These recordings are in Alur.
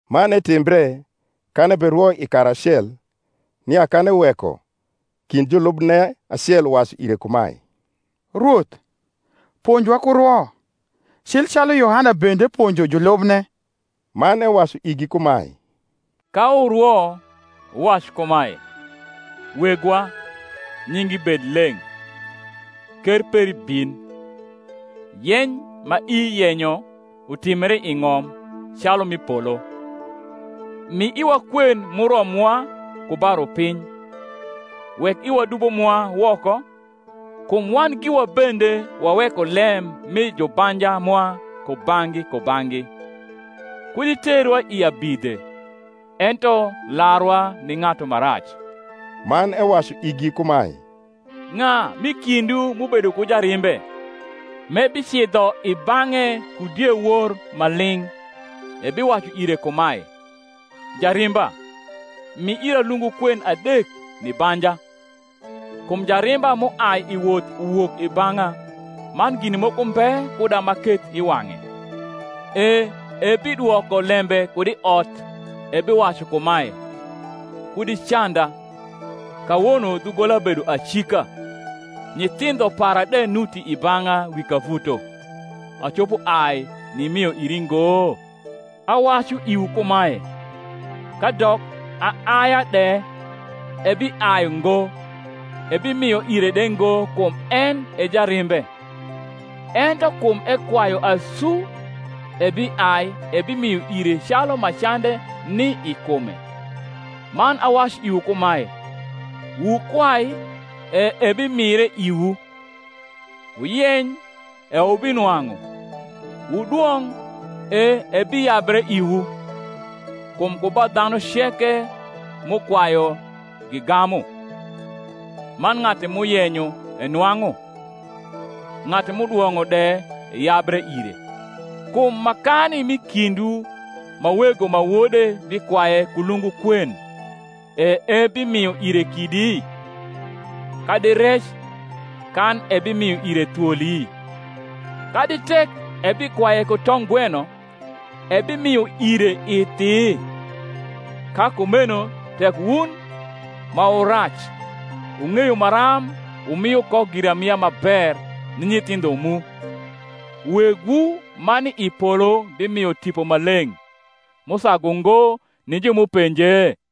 Man etimbre, kan eberwo i kar acel, nia kan eweko, kind julubne acel uwacu ire kumae, Rwoth, ponjwa ku rwo, cil calu Yohana bende ponjo julubne. Man ewacu igi kumae, Ka wurwo, wuwac kumae, Wegwa, nyingi bed leng’. Ker peri bin. Yeny ma ii yenyo, utimbre i ng’om, calu m’i polo. Mi iwa kwen m’uromwa ku ba rupiny. Wek iwa dubo mwa woko; kum wan giwa bende waweko lem mi jubanja mwa kubang’gi kubang’gi. Kud iterwa i abidhe. Ento larwa ni ng’atu ma rac. Man ewacu igi kumae, Ng’a m’i kindwu m’ubedo ku jarimbe, m’ebicidho i bang’e ku diewor ma ling’, ebiwacu ire kumae, Jarimba, mi ira lungu kwen adek ni banja; kum jarimba m’uai i woth uwok i bang’a, man gin moko mbe kuda m’aketh i wang’e; e ebidwoko lembe kud i ot ebiwacu kumae, Kud icanda: kawono dhugola bedo acika, nyithindo para de nuti i bang’a wi kavuto; acopo ai nimio iri ngo? Awacu iwu kumae, Kadok aaia de ebiai ngo ebimio ire de ngo kum en e jarimbe, ento kum ekwayu asu ebiai ebimio ire calu ma cande ni i kume. Man awacu iwu kumae, Wukwai, e ebimire iwu; wuyeny, e wubinwang’u; wudwong’, e ebiyabre iwu. Kum ku ba dhanu ceke m’ukwayu gigamu; man ng’atu m’uyenyo enwang’u; ng’atu m’udwong’o de eyabre ire. Kum makani m’i kindwu ma wego ma wode bikwaye ku lungu kwen, e ebimio ire kidi? kadi rec, kan ebimio ire thwoli? Kadi tek ebikwaye ku tong’gweno, ebimio ire ithi? Ka kumeno tek wun, ma wu rac, wung’eyo maram wumio ko giramia ma ber ni nyithindho mu, Wegwu ma ni i polo bimio Tipo Maleng’ m’usagu ngo ni ju m’upenje?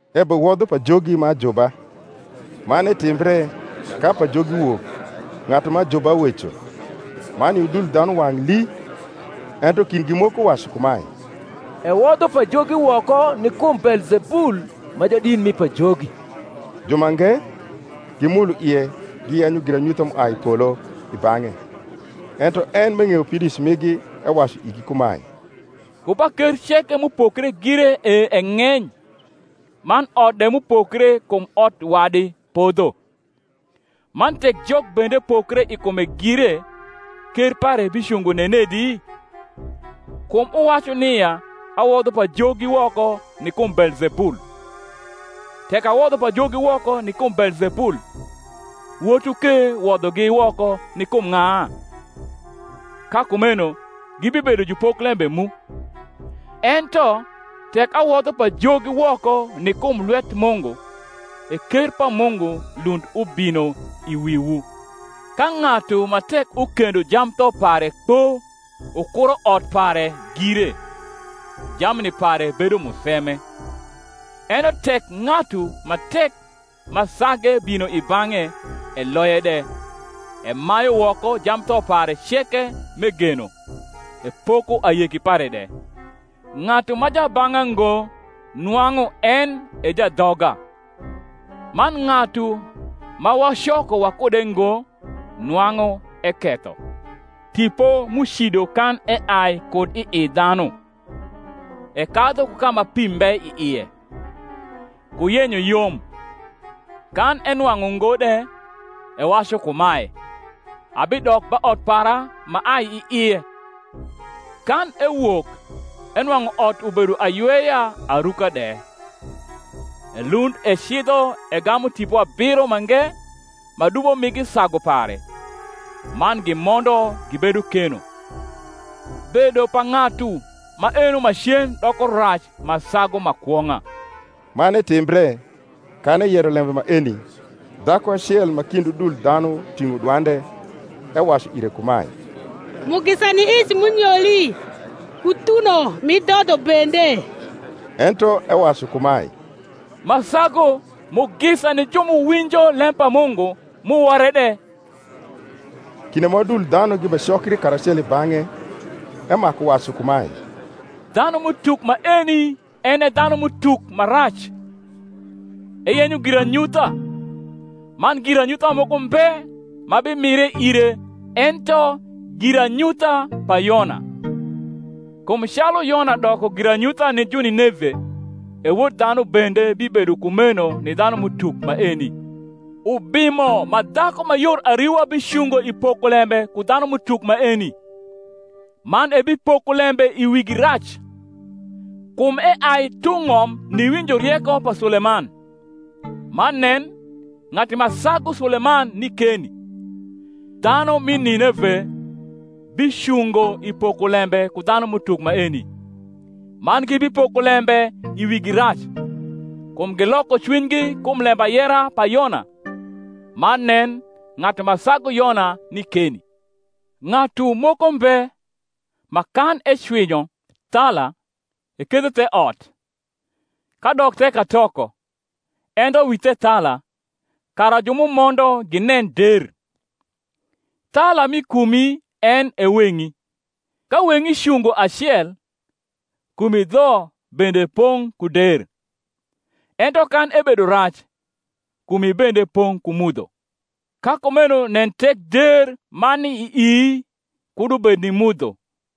Ebewodho pajogi ma ajuba. Man etimbre, ka pajogi wok, ng’atu ma ajuba weco; man i udul dhanu wang’ lii. Ento kindgi moko wacu kumae, Ewodho pajogi woko ni kum Beelzebul ma jadit mi pajogi. Jumange, gimulo ie giyenyo giranyutha m’uai i polo i bang’e. Ento en, m’eng’eyo pidoic migi, ewacu igi kumae, Ku ba ker ceke m’upokre gire e eng’eny; man ot de m’upokre kum ot wadi podho. Man tek Jok bende pokre i kume gire, ker pare bicungo nenedi? kum wuwacu nia awodho pajogi woko ni kum Beelzebul. Tek awodho pajogi woko ni kum Beelzebul, wotwu ke wodhogi woko ni kum ng’a? ka kumeno gibibedo jupoklembe mu. Ento tek awodho pajogi woko ni kum lwet Mungu, e ker pa Mungu lund ubino i wiwu. Ka ng’atu ma tek ukendo jamtho pare kpo ukuro ot pare gire, jamni pare bedo museme: ento tek ng’atu ma tek ma sage bino i bang’e, eloye de, emayu woko jamtho pare ceke m’egeno, epoko ayeki pare de. Ng’atu ma jabang’a ngo nwang’u en e jadhoga; man ng’atu ma wacoko wakude ngo nwang’u eketho. Tipo m’ucido kan eai kud ii dhanu, ekadhu ku ka ma pi mbe i ie, ku yenyo yom, kan enwang’u ngo de, ewacu kumae, Abidok ba ot para m’aai i ie. Kan ewok, enwang’u ot ubedo ayweya aruka de. Elund ecidho egamu tipo abiro mange ma dubo migi sagu pare; man gimondo gibedo keno: bedo pa ng’atu maeno macen doko rac ma sagu ma kwong’a. Man etimbre, kan eyero lembe maeni, dhaku acel ma kind udul dhanu ting’o dwande, ewacu ire kumae, Mugisa ni ic m’unyoli, ku thuno m’idhodho bende. Ento ewacu kumae, Ma sagu, mugisa ni ju m’uwinjo lem pa Mungu, m’uwore de. Kinde ma udul dhanu gibecokri karacelo i bang’e, emaku wacu kumae, dhanum’utuk maeni en e dhanum’utuk ma rac: eyenyo giranyutha; man giranyutha moko mbe ma bimire ire ento giranyutha pa Yona. Kum calu Yona doko giranyutha ni Junineve, e Wod dhanu bende bibedo kumeno ni dhanum’utuk maeni, Ubimo ma dhaku ma yor ariwa bicungo i pokolembe ku dhanum’utuk maeni, man ebipoko lembe i wigi rac: kum eai tung’ ng’om niwinjo rieko pa Suleman; man nen, ng’atu ma sagu Suleman ni keni. Dhanu mi Nineve bicungo i pokolembe ku dhanum’utuk maeni, man gibipoko lembe i wigi rac: kum giloko cwinygi kum lembayera pa Yona; man nen, ng’atu ma sagu Yona ni keni. Ng’atu moko mbe, ma kan ecwinyo thala, ekethe the ot, kadok the katoko, ento wi thethala, kara ju m’umondo ginen der. Thala mi kumi en e weng’i: ka weng’i cungo acel, kumi dho bende pong’ ku der; ento kan ebedo rac, kumi bende pong’ ku mudho. Ka kumeno nen tek der ma ni ii kud ubed ni mudho.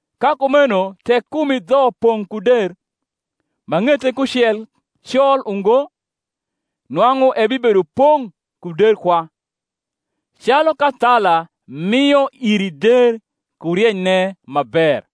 Ka kumeno tek kumi dho pong’ ku der, ma ng’ete kucel col ungo, nwang’u ebibedo pong’ ku der kwa, calu ka thala mio iri der ku rienyne ma ber.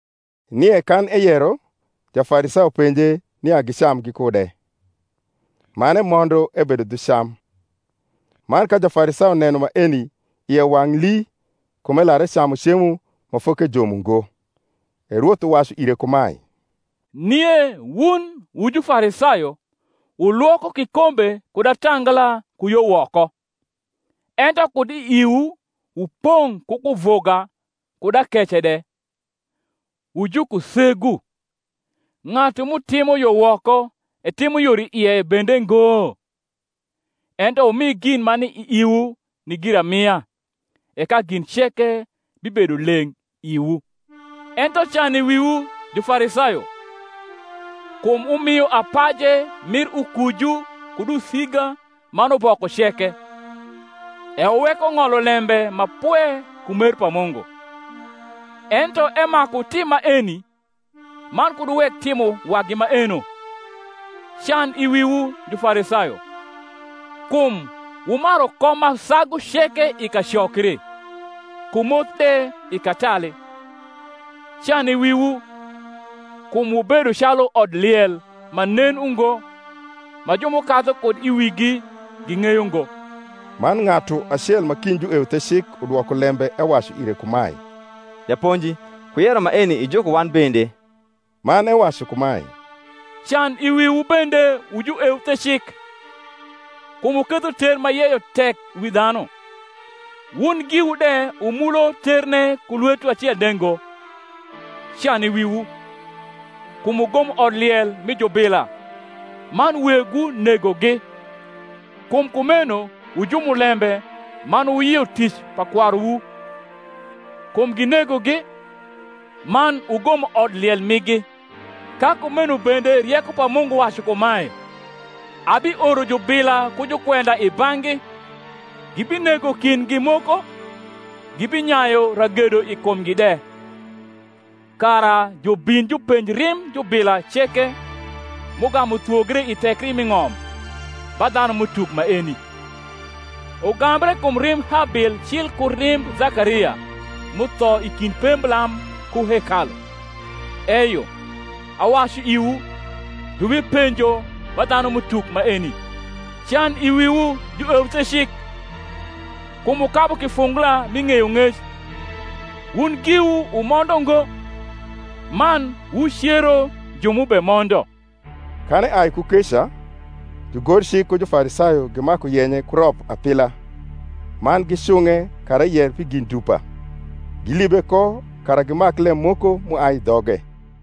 Nie kan eyero, Jafarisayo penje nia gicam gikude: man emondo, ebedo dhu cam. Man ka Jafarisayo neno maeni, ie wang’ lii kum elar ecamu cemo ma fokejom ungo. E Rwoth uwacu ire kumae, Nie wun wu Jufarisayo wulwoko kikombe kud atangla ku yo woko; ento kud i iwu wupong’ ku kuvuga kud akece de. Wu jukusegu, ng’atu m’utimo yo woko etimo yor i ie bende ngo? Ento wumi gin ma ni i iwu ni giramia; e ka gin ceke bibedo leng’ iwu. Ento can i wiwu, Jufarisayo! kum wumio apaje mir ukuju kud usiga man uboko ceke, e wuweko ng’olo lembe ma pwe ku mer pa Mungu: ento emaku wutim maeni, man kud wuwek timo wagi maeno. Can i wiwu Jufarisayo! kum wumaru kom ma sagu ceke i kacokri, ku moth de i katali. Can i wiwu! kum wubedo calu odliel ma nen ungo, ma ju m’ukadhu kud i wigi ging’eyo ngo. Man ng’atu acel ma kind jueuthecik udwoko lembe ewacu ire kumae, Japonji, ku yero maeni ijuko wan bende. Man ewacu kumae, Can i wiwu bende wu jueuthecik! kum wuketho ter ma yeyo tek wi dhanu, wun giwu de wumulo terne ku lwetwu acel de ngo. Can i wiwu! kum wugomo odliel mi jubila, man wegwu negogi. Kum kumeno wu jumulembe man wuyio tic pa kwaruwu: kum ginegogi, man wugomo odliel migi. Ka kumeno bende rieko pa Mungu wacu kumae, Abioro jubila ku jukwenda i bang’gi; gibinego kindgi moko gibinyayu ragedo i kumgi de; kara jubin jupenj rimb jubila ceke, m’ugamu thwogre i thekri mi ng’om, ba dhanum’utuk maeni; ugambre kum rimb Habil cil ku rimb Zakaria, m’utho i kind pemblam ku hekalu: eyo, awacu iwu, jubipenjo ba dhanum’utuk maeni. Can i wiwu jueuthecik! kum wukabu kifungula mi ng’eyong’ec: wun giwu wumondo ngo, man wucero ju m’ubemondo. Kan eai ku keca, jugorcik ku Jufarisayo gimaku yenye ku rop apila, man gicung’e kara eyer pi gin dupa; gilibe ko, kara gimak lem moko m’uai i dhoge.